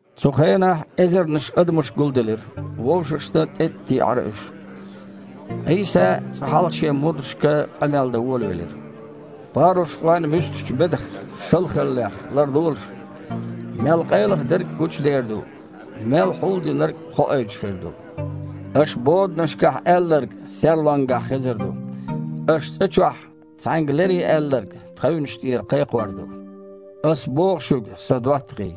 Цу хенахь эзарнаш адамаш гулделира, вовшашна тІеттІатеІара уьш. Іийса цкъа хьалха шен мурдашка къамел дан волавелира: «Парушхойн муьстачу бедах – шалхаллех ларлолаш. Мел къайлаха дерг а гучудер ду, мел хьулдинарг а хоуьйтуш хир ду. Аша боданашкахь аьлларг серлонгахь хезар ду. Аша цІа чохь цхьаьнга лере аьлларг тхевнаш тІера кхайкхор ду». «Ас боху шуьга, Сан доттагІий,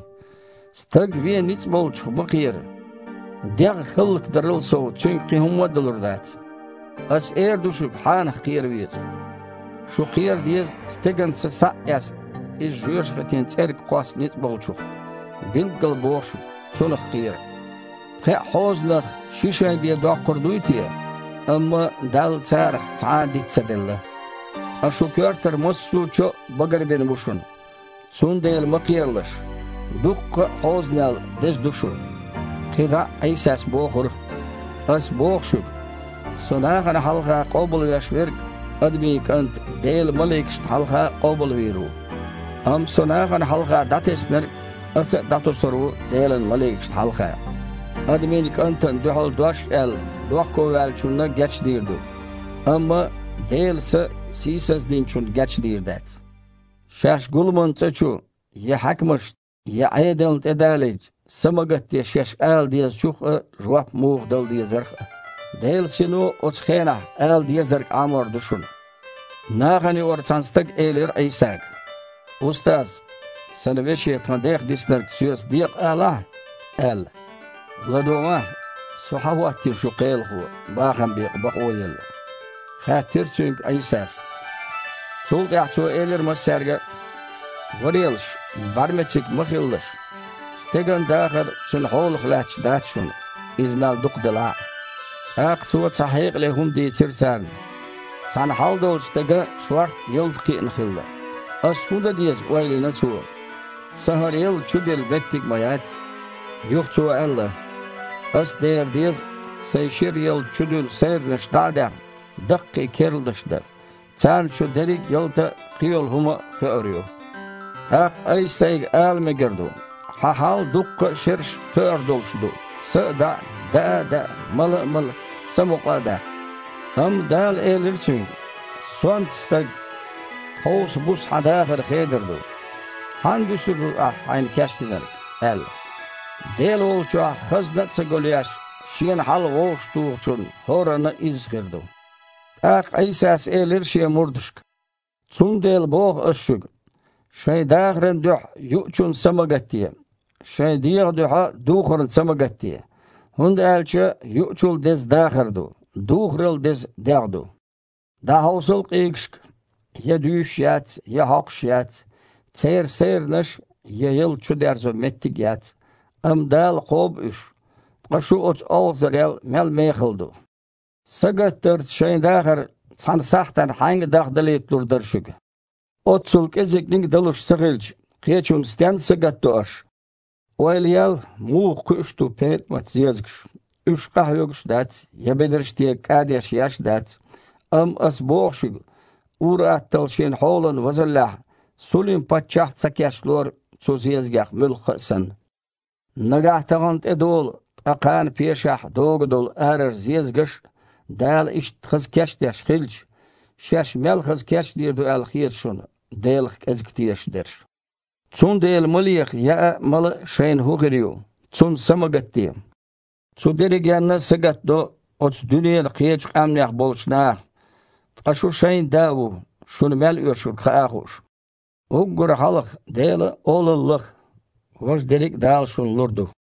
стаг вен ницкъ болчух ма кхера, дегІ хІаллакдарал сов цуьнга кхин хІумма а далур дац. Ас эр ду шуьга хьанах кхера веза: шу кхера деза стеган са схьа а эцна, иза жоьжахатин цІерга кхосса ницкъ Болчух. Билггала боху шуьга, Цунах кхера! Пхеа хьозанах ши шай бен доккхур дуй те? Амма Далла царах цхьа а диц ца делла. Ткъа шун коьртара массо чо а багарбина бу шуна! Цундела ма кхералаш: дуккха а хьозанел деза ду шу!» Кхин дІа а Іийсас бохура: «Ас боху шуьга: Со нахана хьалха къобалвеш верг Адамийн КІанта Делан маликашна хьалха къобалвийр ву, амма Со нахана хьалха дІатеснарг Аса а дІатосур ву Делан маликашна хьалха. Адамийн КІантана дуьхьал дош а аьлла, дохковаьллачунна гечдийр ду, амма Делан Са сийсаздинчунна гечдийр дац. Шаьш гуламан цІа чу, я хьаькамашна, я Іедална тІе далийча, са ма гатде шаьш ала дезачух а, жоп муха дала дезарх а, Делан Сино оцу хенахь ала дезарг Іамор ду шуна». Нахана юкъара цхьана стага элира Іийсага: «Устаз! Сан веше тхан дех диснарг соьца декъа алахьа!» – аьлла. «ЛадогІахьа, Со хьан хІоттийна шун кхелахо, бахам бекъа бакъо а елла?» – хаьттира цуьнга Іийсас. Цул тІаьхьа Цо элира массаьрга а: «Варелаш! БІаьрмециг ма хилалаш. Стеган дахар цуьнан хьолах лаьтташ дац шуна, иза мел дукха делахь а». ТІаккха Цо цхьа хьекъале хІума дийцира царна: «Цхьана хьал долчу стеган шортта ялта кхиъна хилла. „Ас хІун дан деза? – ойла йина цо. – Сан хІара ялта чудилла меттиг ма яц“. Юха цо аьлла: „Ас дера деза, сайн шира ялта чудуьллу сайранаш дІа а даьхна, даккхий керланаш дан. Царна чу дерриг ялта а, кхийолу хІума а хоьур ю. ТІаккха айса-сайга ала мегар ду: хьан хьал дуккха а шерашна тоьар долуш ду, са а даІа, даа а даа, мала а мала, самукъа а даккха“. Амма Дала элира цуьнга: „Сонта стаг! Тховса буса хьан дахар хедар ду. Хьанна дуьсур ду ахь хьайна кечдинарг?“ – аьлла. Дела волчохь хазна а ца гулъеш, шена хьал вовшахтухучунна хІоранна а изза хир ду». ТІаккха Іийсас элира Шен мурдашка: «Цундела боху Ас шуьга, шайн дахаран дуьхьа юучунна са ма гатде, шайн дегІан дуьхьа духарна са ма гатде. ХІунда аьлча юучул деза дахар ду, духарал деза дегІ ду. ДІахьовсал къийгашка: я дуьйш яц, я хьокхуш яц, церан сайранаш а, я ялта чудерзо меттиг а яц, амма Дала кхобу уьш. Ткъа шу оцу олхазарел мел мехала ду! Сагатдарца шайн дахар цхьана сахьтана хьаьнга дахдалийталур дара шуьга? Оццул кІезигниг а далуш ца хилча, кхечунна стенна сагатдо аш? Ойла ел, муха кхуьуш ду петІамат-зезагаш: уьш къахьоьгуш дац я бедарш тега кІадеш еш дац, амма Ас боху шуьга, ур-атталла шен хьолан возаллехь Сулим-паччахь а ца кечлора цу зезагех муьлхха а санна. Нагахь тахана тІедолу, ткъа кхана пешахь догу долу арара зезагаш а Дала иштта хаза кечдеш хилча, шаьш мел хаза кечдийр ду аьлла хета шуна, Делах кІезиг тешаш дерш?! Цундела ма леха яа а, мала а шайна хІун хир ю – цунна са ма гатде. Цу дерригенна а сагатдо оцу дуьненан кхечу къаьмнех болчу наха. Ткъа шун шайн Да ву, шуна мел оьшург хаа а хууш. Уггар хьалха Делан Олалла лаха, важа дерриг а Дала шуна лур ду».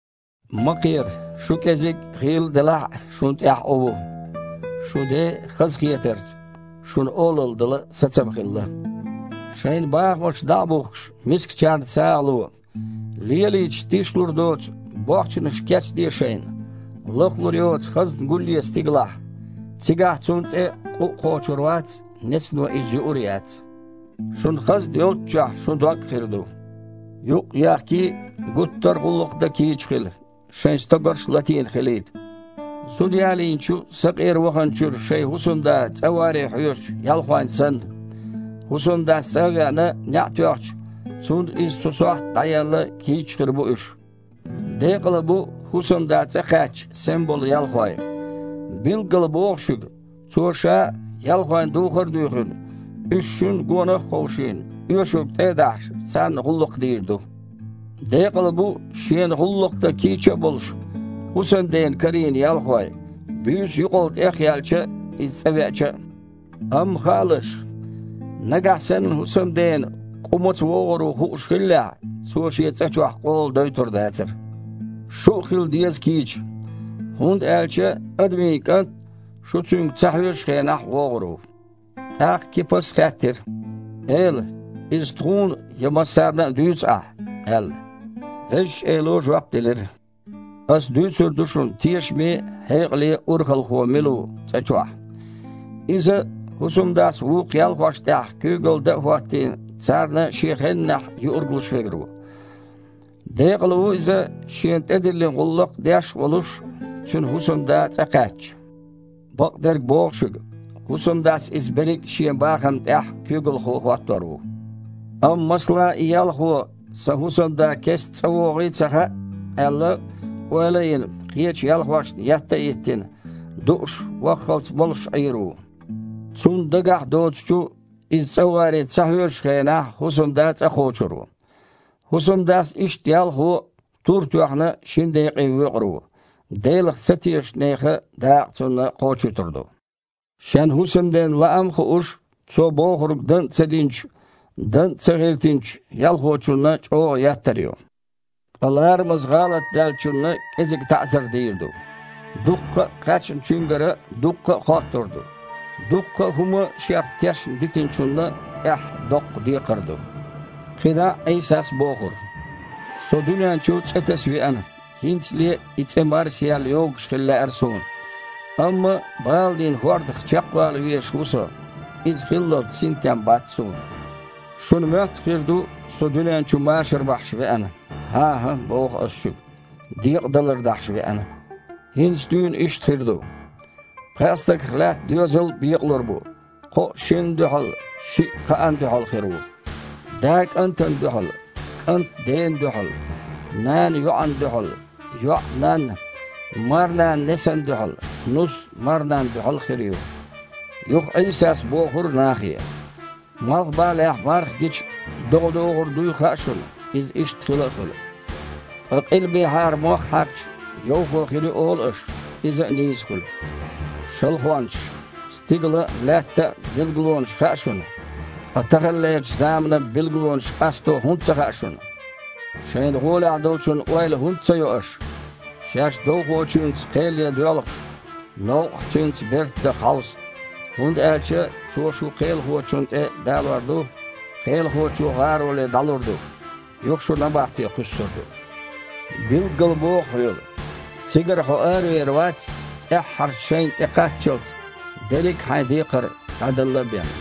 «Ма кхера, шу кІезиг а, гІийла а делахь а, шуна тІехь Іу ву. Шун Ден, хазахетарца, шуна Олалла дала сацам хилла. Шайн бахамаш дІа а бухкуш, мискачарна сагІа ло. Лелийча тишлур доцу бохчанаш кечде шайна, лахлур йоцу хазна гулъе стигалахь: цигахь цунна тІе къу а кхочур вац, нецано иза юур а яц. Шун хазна йолччохь, шун дог а хир ду». «Юкъ а ехкий, гуттар а гІуллакх дан кийча хила, шайн стогарш а латийна хилийта, зуда ялийначу сакъера ваханчуьра шайн хІусамда цІа варе хьоьжучу ялхойн санна. ХІусамдас, цІа а веана, неІ тоьхча, цунна иза оцу сохьта дІаелла кийчча хир бу уьш. Декъала бу, хІусамда цІа кхаьчча, сема болу ялхой. Билггала боху шуьга, цо ша а, ялхойн духар а дуьйхина, уьш шуьнна гонах а ховшийна, оьшург тІе а дахьаш, царна гІуллакх дийр ду. Декъала бу, шена гІуллакх дан кийча а болуш, хІусамдена карийна ялхой, буьйса юкъал тІехъяьлча иза цІа веача а. Амма хаалаш, нагахь санна хІусамдена къу маца вогІур ву хууш хиллехь, цо шен цІа чохь къола дойтур дацара. Шу а хила деза кийча, хІунда аьлча Адамийн КІант шу Цуьнга ца хьоьжучу хенахь вогІур ву». ТІаккха Кипас хаьттира: «Эла! Иза тхуна я массарна а дуьйцу Ахь?» – аьлла. Везачу Эло жоп делира: «Ас дуьйцур ду шуна тешаме а, хьекъале а урхалхо мила ву цІа чохь: иза, хІусамдас вукху ялхошна тІехь куьйгалла дан а хІоттийна, царна шен хеннахь юург луш верг ву. Декъала ву иза, шена тІедиллина гІуллакх деш а волуш, цуьнан хІусамда цІа кхаьчча. Бакъдерг боху шуьга: хІусамдас иза берриг шен бахамна тІехь куьйгалхо хІоттор ву. Амма, масала, и ялхо: „Сан хІусамда кеста цІа вогІий ца хаьа“, – аьлла, ойла а йина, кхечу ялхошна етта а йиттина, дууш, ваххалц молуш Іийр ву. Цунна дагахь а доцучу, иза цІа варе ца хьоьжучу хенахь, хІусамда цІа кхочур ву. ХІусамдас иштта ялхо, тур тоьхна, шина декъе воькъур ву, Делах ца тешачу нехан дакъа цунна кхочуьйтур ду. Шен хІусамден лаам а хууш, цо бохург дан а ца динчу, дан а ца гІиртинчу ялхочунна чІогІа еттар ю, ткъа ларамаза гІалат даьллачунна кІезиг таІзар дийр ду. Дуккха а кхаьчначуьнгара дуккха а хоттур ду, дуккха а хІума шех тешна дитинчунна тІехь доккха декхар ду». КхидІа а Іийсас бохура: «Со дуьнен чу цІе таса веана, хІинцале и цІе марсаяьлла йогуш хила лаьара Суна! Амма баланийн хІордах чекхвала везаш ву Со, иза хиллалц синтем бац Суна! Шуна моьтту хир ду, Со дуьнен чу машар бахьаш веана? „ХІан-хІа! – боху Ас шуьга, – Декъадалар дахьаш веана!“ ХІинца дуьйна иштта хир ду: пхеа стагах лаьтта доьзал бекъалур бу, кхоъ шинна дуьхьал, шиъ кхаанна дуьхьал хир ву. Да кІантана дуьхьал, кІант дена дуьхьал, нана йоІана дуьхьал, йоІ-нанна, марнана несана дуьхьал, нус марнанна дуьхьал хир ю». Юха Іийсас бохура нахе: «Малхбалехь марха гича, догІа догІур дуй хаьа шуна, иза иштта хила а хуьлу. Ткъа къилбехьара мох хьаькхча, йовхо хир ю олу аш, иза а нийса хуьлу. Шалхончаш! Стигалан а, лаьттан а билгалонаш хаьа шуна, ткъа таханлерчу заманан билгалонаш къасто хІунда ца хаьа шуна?» «Шайна гІолехь долчун ойла хІунда ца йо аш? Шаьш довхочуьнца кхел ян доьлхуш, новкъахь цуьнца берта даха хьовса, хІунда аьлча цо шу кхелахочунна тІе далор ду, кхелахочо гІароле дІалур ду, юха шу набахте кхуьссур ду. Билггала боху хьоьга: цигара хьо аравер вац, тІаьххьарчу шайнна тІекхаччалц, дерриг а хьайн декхар дІаделла а бен».